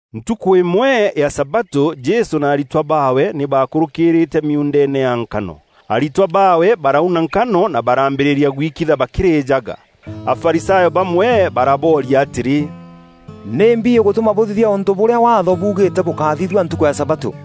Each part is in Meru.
Ntukû îmwe ya sabatû Jesû na aritwa baawe nî baakûrûkîrîîte miuundeene ya nkano. Aritwa baawe barauna nkano na baraambîrîria gwikitha bakîrîjaga. Afarisayo bamwe barabooria atîrî, “Nîmbi îgûtûma bûthithia ûntû bûrîa Waatho buugîîte bûkáthithua ntukû ya sabatû?”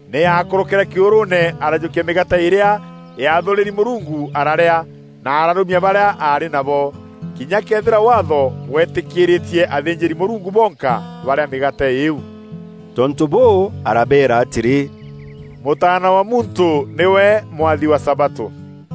Nî aakûrûkîre kîûrûûne arajûkia mîgaate îrîa yaathûrîri Mûrungu ararîa, na ararûmia barîa aarî nabo, kinya këethîra Waatho bwetîkîîrîtie athînjîri-Mûrungu bonka barîa mîgaate îîu.” Tontû bûû, arabeera atîrî, “Mûtaana wa Muntû nîwe Mwathi wa sabatû.”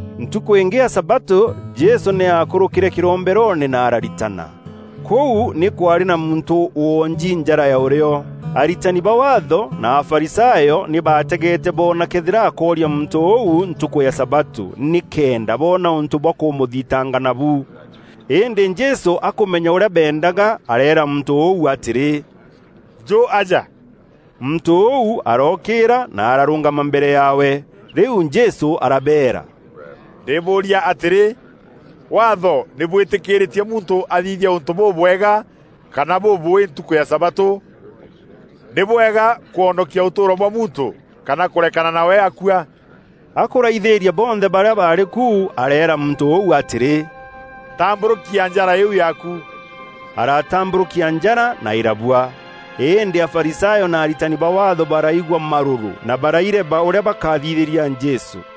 Ntukû îngî ya sabatû, Jesû nî aakûrûkîre kîromberoone na araritana. Kûu nî kwaarî na muntû woonji njara ya ûrîo. Aritani ba Waatho na Afarisayo nî baategeete boona këethîra akooria muntû ûu ntukû ya sabatû, nîkenda boona ûntû bwa kûmûthitanga nabu. Îndî Jesû akûmenya ûrîa beendaga, areera muntû ûu atîrî, “Njû aja.” Muntû ûu arookîîra na ararûngama mbere yaawe. Rîu Jesû arabeera, “Ndîbûûria atîrî, Waatho nî bwîtîkîîrîtie muntû aathithia ûntû bûbwega kana bûbûûî ntukû ya sabatû? Nî bwega kwonokia ûtûûro bwa muntû kana kûrekana nawe akua?” Akûraithîîria bonthe barîa baarî ku, areera muntû ûu atîrî, “Tambûrûkia njara îîu yaaku.” Aratambûrûkia njara, na îrabua. Îndî Afarisayo na aritani ba Waatho baraigua marûrû, na baraireba ûrîa bakathithîria Jesû.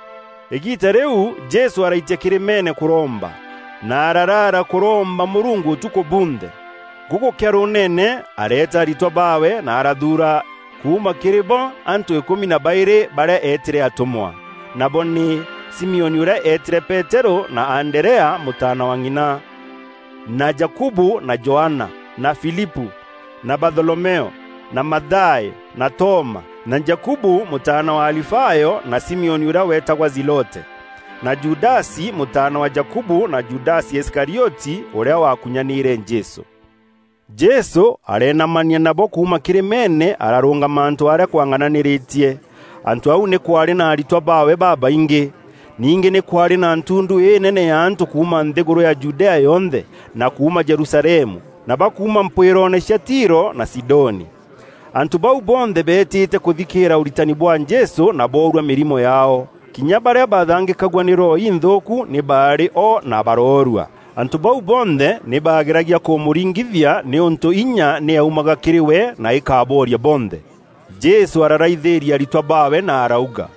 Îgiita rîu Jesû araitia kîrîmeene kûromba, na araraara kûromba Mûrungu ûtukû bunthe. Gûgûkea rûûnene, areeta aritwa baawe na arathuura kuuma kîrî bo antû îkûmi na baîrî barîa eetîre atûmwa. Nabo nî: Simioni ûrîa eetîre Peterû na Anderea mûtaana wa ng'ina, na Jakubu na Johana, na Filipû na Batholomeo, na Mathayo na Toma, na Jakubu mûtaana wa Alifayo na Simioni ûrîa weetagwa Zilote, na Judasi mûtaana wa Jakubu na Judasi Iskarioti, ûrîa waakunyanîîre Jesû. Jesû areenamania nabo kuuma kîrîmeene ararûngama antû arîa kwang'ananîrîtie. Antû au nî kwaarî na aritwa baawe babaingî. Ningî nî kwaarî na ntundu înene ya antû kuuma nthîgûrû ya Judea yonthe, na kuuma Jerusalemu na ba kuuma mpwîroone cia Tiro na Sidoni. Antû bau bonthe beetîte kûthikîîra ûritani bwa Jesû na boorua mîrimo yaao. Kinya barîa baathangîkagua nî roho inthûûku nî baarî o na baroorua. Antû bau bonthe nî baageragia kûmûringithia nîûntû inya nî yaumaga kîrî we na îkabooria bonthe. Jesû araraithîria aritwa baawe na arauga,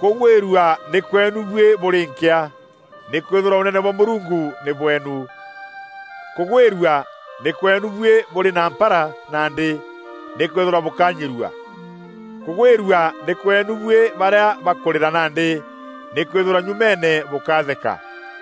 “Kûgwîrua nî kweenu buî bûrî nkîa, nîkwîthîrwa Ûnene bwa Mûrungu nî bweenu. Kûgwîrua nî kweenu buî bûrî na mpara nandî, nîkwîthîrwa bûkanyirua. Kûgwîrua nî kweenu buî barîa bakûrîra nandî, nîkwîthîrwa nyumeene bûkatheka.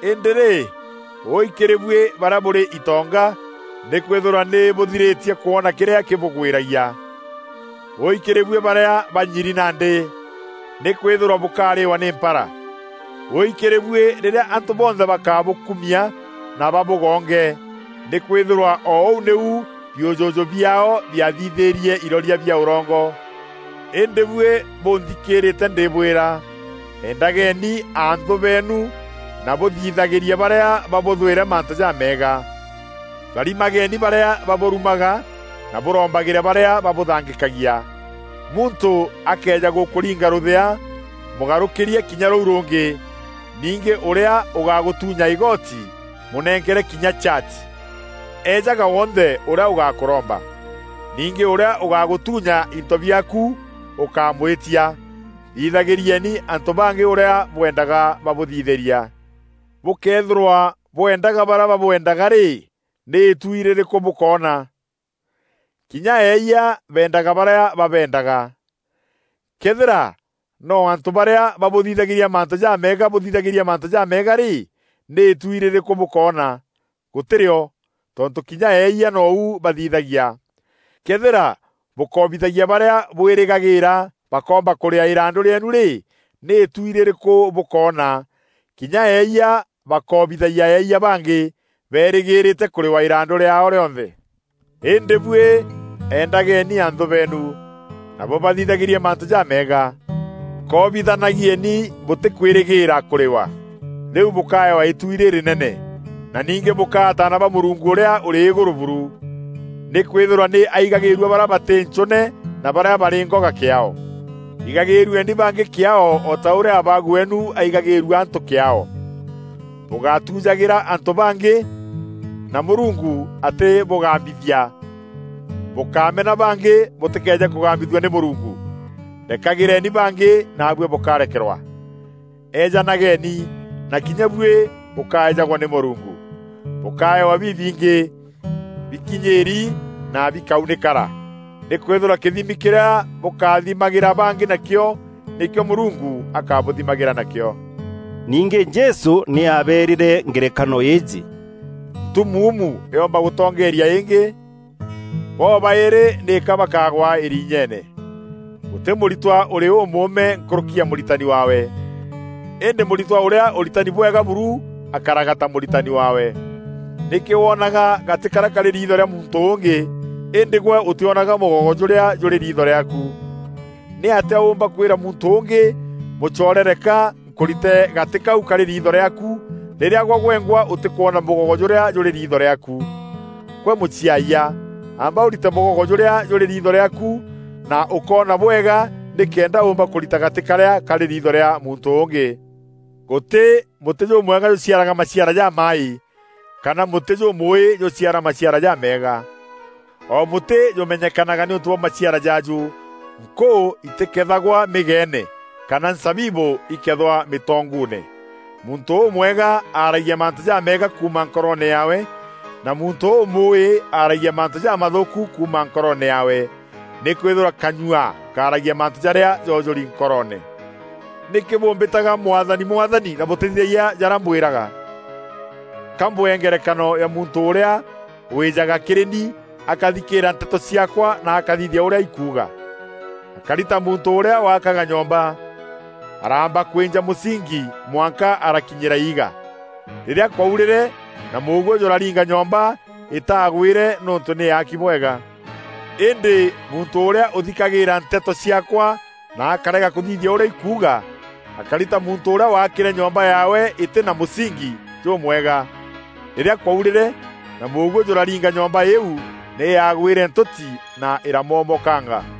Îndî rî, wûi kîrî buî barîa bûrî itonga, nîkwîthîrwa nî bûthirîtie kwona kîrîa kîbûgwîragia. Wûi kîrî buî barîa banyiri nandî, nîkwîthîrwa bûkarîîwa nî mpara. Wûi kîrî buî rîrîa antû bonthe bakabûkûmia na babûgonge, nîkwîthîrwa o ûu nîu biûjûjû biaao biaathithîîrie iroria bia ûrongo.” “Îndî buî bûnthikîîrîte ndîbwîra: endageni anthû beenu na bûthithagîrie barîa babûthwîre mantû jameega. Tharimageni barîa babûrumaga na bûrombagîre barîa babûthangîkagia. Muntû akëeja gûkûringa rûthea, mûgarûkîrie kinya rûu rûngî. Ningî ûrîa ûgagûtûnya îgoti, mûnenkere kinya chati. Ejaga wonthe ûrîa ûgakûromba. Ningî ûrîa ûgagûtuunya into biaaku ûkamwîtia. Thithagîrieni antû bangî ûrîa bwendaga babûthithîria.” “Bûkëethîrwa bwendaga barîa babwendaga rî, nî îtuui rîrîkû bûkoona? Kinya eeyia beendaga barîa babeendaga. Këethîra no antû barîa babûthithagîria mantû jameega bûthithagîria mantû jameega rî, nî îtuui rîrîkû bûkoona? Gûtî rîo! Tontû kinya eeyia nou bathithagia. Këethîra bûkoobithagia barîa bwîrîgagîîra bakoomba kûrîaa îrandû rîeenu rî, nî îtuui rîrîkû bûkoona? Kinya eeyia bakoobithagia eeyia bangî, berîgîrîte kûrîwa îrandû rîaao rîonthe. Îndî buî endageni anthû beenu, na bûbathithagîrie mantû jameega. Koobithanagieni bûtîkwîrîgîîra kûrîwa; rîu bûkaewa îtuui rîrînene, na ningî bûkaa ataana ba Mûrungu Ûrîa Ûrî Îgûrû buru. Nîkwîthîrwa nî aigagîîrua barîa batî ncûûne na barîa barî ngoga kîaao. Igagîîrueni bangî kîaao o ta ûrîa Abaagu weenu aigagîîrua antû kîaao.” “Bûgátujagîra antû bangî, na Mûrungu atîbûgambithia; bûkámena bangî bûtîkeeje kûgambithua nî Mûrungu. Rekagîreeni bangî naabuî bûkarekerwa. Eejanageni, na kinya buî bûkaejagwa nî Mûrungu. Bûkaewa bibingî, bikinyîîri, na bikaunîkara. Nîkwîthîrwa kîthimi kîrîa bûkathimagîra bangî nakîo, nîkîo Mûrungu akabûthimagîra nakîo.” Ningî Jesû nî aabeerîre ngerekano îîjî: “Ntumuumu yoomba gûtongeeria îngî? Bo-baîrî nîka bakaagwa îriinyeene. Gûtî mûritwa ûrî ûûme nkûrûki ya mûritani waawe. Îndî mûritwa ûrîa ûritani bwega buru akaraga ta mûritani waawe. Nîkî woonaga gatî karîa karî riitho rîa muntû ûngî, îndî gwe ûtîonaga mûgogo jûrîa jûrî riitho rîaaku? Nîatîa ûûmba kwîra muntû ûngî, ‘Mûcoore, reka nkûrite gatî kau karî riitho rîaaku,’ rîrîa gwe gwengwa ûtîkwona mûgogo jûrîa jûrî riitho rîaaku? Gwe mûciayia, amba ûrite mûgogo jûrîa jûrî riitho rîaaku, na ûkoona bwega nîkenda ûûmba kûrita gatî karîa karî riitho rîa muntû ûngî.” “Gûtî mûtî jûmwega jûciaraga maciara jamaaî, kana mûtî jûmûûî jûciara maciara jameega. O mûtî jûmenyekanaga nîûntû bwa maciara jaaju. Nkûû itîkeethagwa mîgeene kana nzabibû ikethwa mîtonguune. Muntû ûmwega aragia mantû jaameega kuuma nkoroone yaawe, na muntû ûmûûi aragia mantû jamathûûku kuuma nkoroone yaawe. Nîkwîthîrwa kanyua kaaragia mantû jarîa joojûri nkoroone.” “Nîkî bûmbîtaga ‘Mwathani, Mwathani,’ na bûtîthithagia jarîa mbwîraga? Ka mbwee ngerekano ya muntû ûrîa wîjaga kîrî ni, akathikîîra nteto ciaakwa, na akathithia ûrîa ikuuga. Akari ta muntû ûrîa waakaga nyomba. Araamba kwînja mûsingi mwanka arakinyîra iiga. Rîrîa kwaurîre na mûguû jûraringa nyomba, îtaagwîîre nîûntû nî yaaki bwega. Îndî muntû ûrîa ûthikagîîra nteto ciaakwa na akerega kûthithia ûrîa ikuuga, akari ta muntû ûrîa waakîre nyomba yaawe îtî na mûsingi jûmwega. Rîrîa kwaurîre na mûguû jûraringa nyomba îîu, nî yaagwîre ntûti na îramomokanga.”